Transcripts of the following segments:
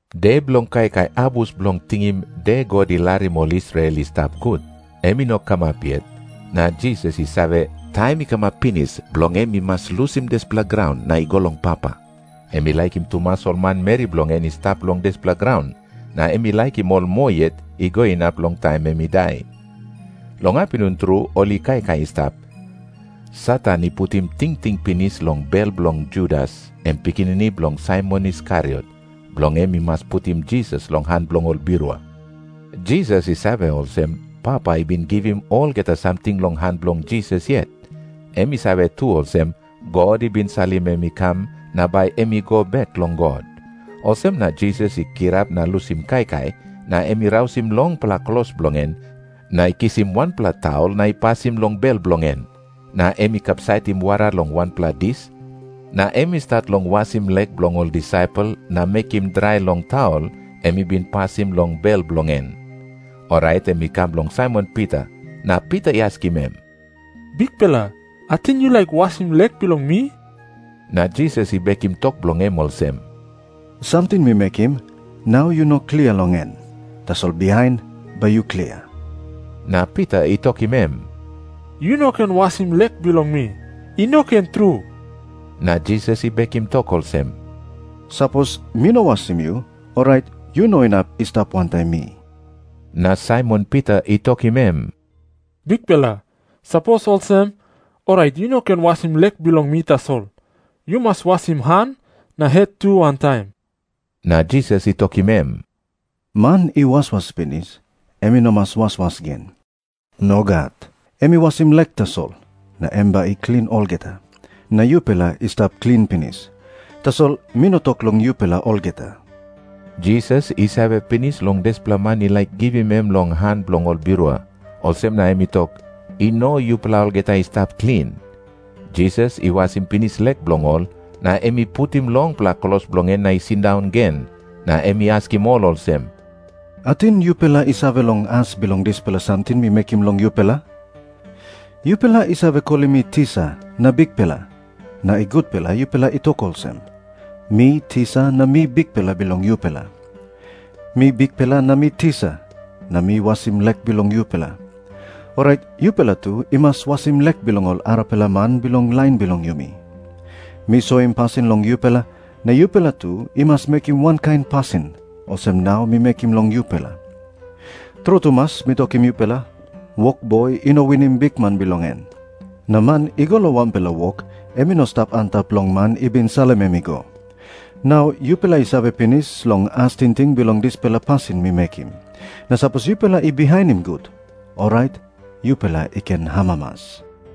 De bilong kaikai abus bilong tingim De God I Larim Ol Israel I Stap Gut em i no kamap yet, na Jisas i save, taim i kamap pinis bilong em i mas lusim dispela graun na i go long Papa. Em i laikim tumas ol manmeri bilong en i stap long dispela graun, na em i laikim ol moa yet i go inap long taim em i dai. Long apinun tru ol i kaikai i stap. Satan i putim tingting pinis long bel bilong Judas, em pikinini bilong Saimon Iskariot, bilong em i mas putim Jisas long han bilong ol birua. Jisas i save olsem, Papa i bin givim olgeta samting long han bilong Jisas yet. Em i save tu olsem, God i bin salim em i kam, na bai em i go bek long God. Olsem na Jisas i kirap na lusim kaikai, na em i rausim longpela klos bilong en, na i kisim wanpela taul na i pasim long bel bilong en. Na em i kapsaitim wara long wanpela dis, na em i stat long wasim lek bilong ol disaipel na mekim drai long taul em i bin pasim long bel bilong en. Orait em i kam long Saimon Pita. Na Pita i askim em, "Bikpela, ating yu laik wasim lek bilong mi?" Na Jisas i bekim tok bilong em olsem, "Samting mi mekim, nau yu no klia long en. Tasol bihain bai yu klia." Na Pita i tokim em, "Yu no ken wasim lek bilong mi. I no ken tru." Na Jisas i bekim tok olsem, "Sapos mi no wasim yu, orait yu no inap i stap wantaim mi." Na Saimon Pita i tokim em, "Bikpela, sapos olsem, orait yu no ken wasim lek bilong mi tasol. Yu mas wasim han na het tu wantaim." Na Jisas i tokim em, "Man i waswas pinis em i no mas waswas gen. Nogat. Em i wasim lek tasol, na em bai i klin olgeta. Na yupela i stap klin pinis. Tasol mi no tok long yupela olgeta." Jisas i save pinis long dispela man i laik givim em long han bilong ol birua. Olsem na em i tok, "I no yupela olgeta i stap klin." Jisas i wasim pinis lek bilong ol, na em i putim longpela klos bilong en na i sindaun gen. Na em i askim ol olsem, "Ating yupela i save long as bilong dispela samting mi mekim long yupela? Yupela i save kolim mi Tisa na Bikpela. Na i gutpela yupela i tok olsem. Mi Tisa na mi Bikpela bilong yupela. Mi Bikpela na mi Tisa, na mi wasim lek bilong yupela. Orait yupela tu i mas wasim lek bilong ol arapela man bilong lain bilong yumi. Mi soim pasin long yupela, na yupela tu i mas mekim wankain pasin olsem nau mi mekim long yupela. Tru tumas mi tokim yupela, wokboi i no winim bikman bilong en. Na man i go long wanpela wok, em i no stap antap long man i bin salim em i go. Nau yupela i save pinis long as tingting bilong dispela pasin mi mekim, na sapos yupela i bihainim gut, orait yupela i ken amamas.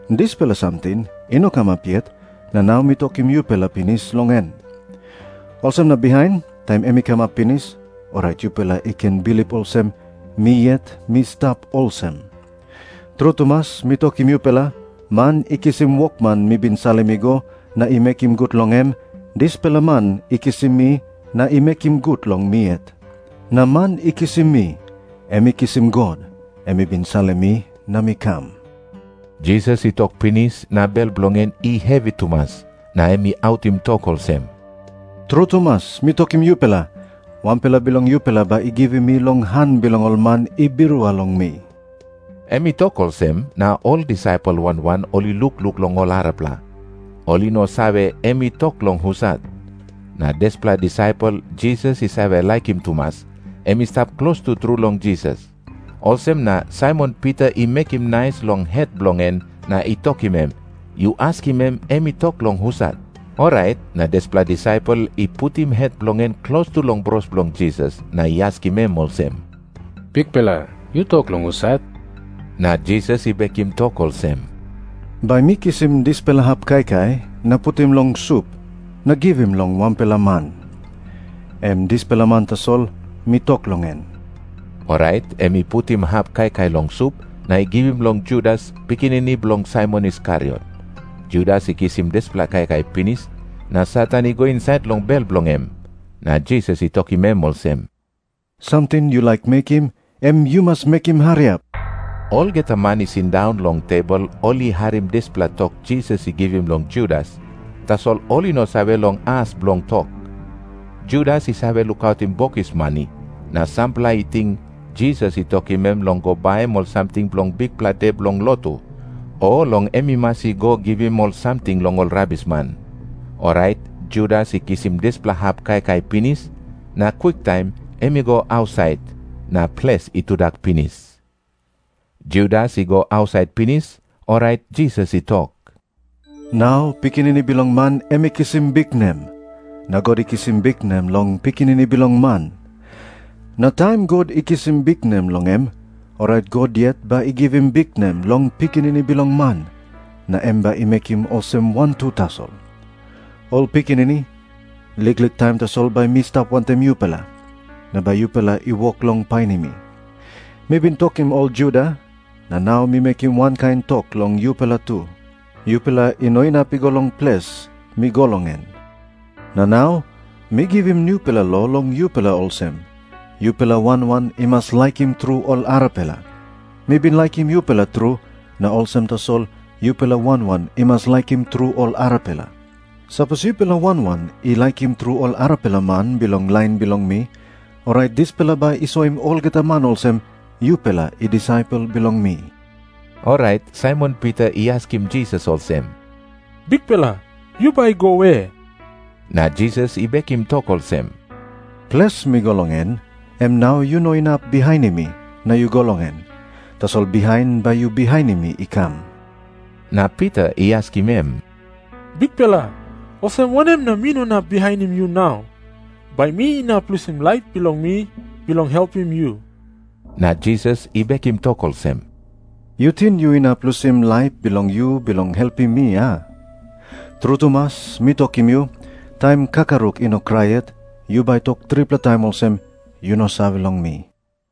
Dispela samting i no kamap yet na nau mi tokim yupela pinis long en. Olsem na bihain, taim em i kamap pinis, orait yupela i ken bilip olsem, Mi Yet Mi Stap Olsem. Tru tumas mi tokim yupela, man i kisim wokman mi bin salim i go, na i mekim gut long em, dispela man i kisim mi na i mekim gut long mi yet. Na man i kisim mi, em i kisim God, em i bin salim mi na mi kam." Jisas i tok pinis na bel bilong en i hevi tumas. Na em i autim tok olsem, "Tru tumas mi tokim yupela, wanpela bilong yupela bai i givim mi long han bilong ol man i birua long mi." Em i tok olsem, na ol disaipel wan wan ol i lukluk long ol arapela. Ol i no save, em i tok long husat. Na dispela disaipel Jisas i save laikim tumas, em i stap klostu tru long Jisas. Olsem na Saimon Pita i mekim nais long het bilong en na i tokim em, "Yu askim em, em i tok long husat." Orait na dispela disaipel i putim het bilong en klostu long bros bilong Jisas na i askim em olsem, "Bikpela, yu tok long husat?" Na Jisas i bekim tok olsem, "Bai mi kisim dispela hap kaikai na putim long sup na givim long wanpela man. Em dispela man tasol mi tok long en." Orait em i putim hap kaikai long sup, na i givim long Judas, pikinini bilong Saimon Iskariot. Judas i kisim dispela kaikai pinis, na Satan i go insait long bel bilong em. Na Jisas i tokim em olsem, "Samting yu laik mekim, em yu mas mekim hariap." Olgeta man i sindaun long tebol ol i harim dispela tok Jisas i givim long Judas, tasol ol i no save long as bilong tok. Judas i save lukautim bokis mani, na sampela i ting Jisas i tokim em long go baim ol samting bilong bikpela de bilong lotu, o long em i mas i go givim ol samting long ol rabisman. Orait Judas i kisim dispela hap kaikai pinis, na kwiktaim em i go ausait. Na ples i tudak pinis. Judas i go ausait pinis, orait Jisas i tok, "Nau Pikinini Bilong Man em i kisim biknem. Na God i kisim biknem long Pikinini Bilong Man. Na taim God i kisim biknem long em, orait God yet bai i givim biknem long Pikinini Bilong Man, na em bai i mekim olsem wantu tasol. Ol pikinini, liklik taim tasol bai mi stap wantaim yupela. Na bai yupela i wok long painim mi. Mi bin tokim ol Juda, na nau mi mekim wankain tok long yupela tu, yupela i no inap i go long ples mi go long en. Na nau mi givim nupela lo long yupela olsem, yupela wan wan i mas laikim tru ol arapela. Mi bin laikim yupela tru, na olsem tasol yupela wan wan i mas laikim tru ol arapela. Sapos yupela wan wan i laikim tru ol arapela man bilong lain bilong mi, orait dispela bai i soim olgeta man olsem, yupela i disaipel bilong mi." Orait Saimon Pita i askim Jisas olsem, "Bikpela, yu bai go we?" Na Jisas i bekim tok olsem, "Ples mi go long en, em nau yu no inap bihainim mi na yu go long en. Tasol bihain bai yu bihainim mi i kam." Na Pita i askim em, "Bikpela, olsem wanem na mi no inap bihainim yu nau? Bai mi inap lusim laip bilong mi bilong helpim yu." Na Jisas i bekim tok olsem, "Yu ting yu inap lusim laip bilong yu bilong helpim mi, a? Tru tumas mi tokim yu, taim kakaruk i no krai yet, yu bai tok tripela taim olsem, yu no save long mi."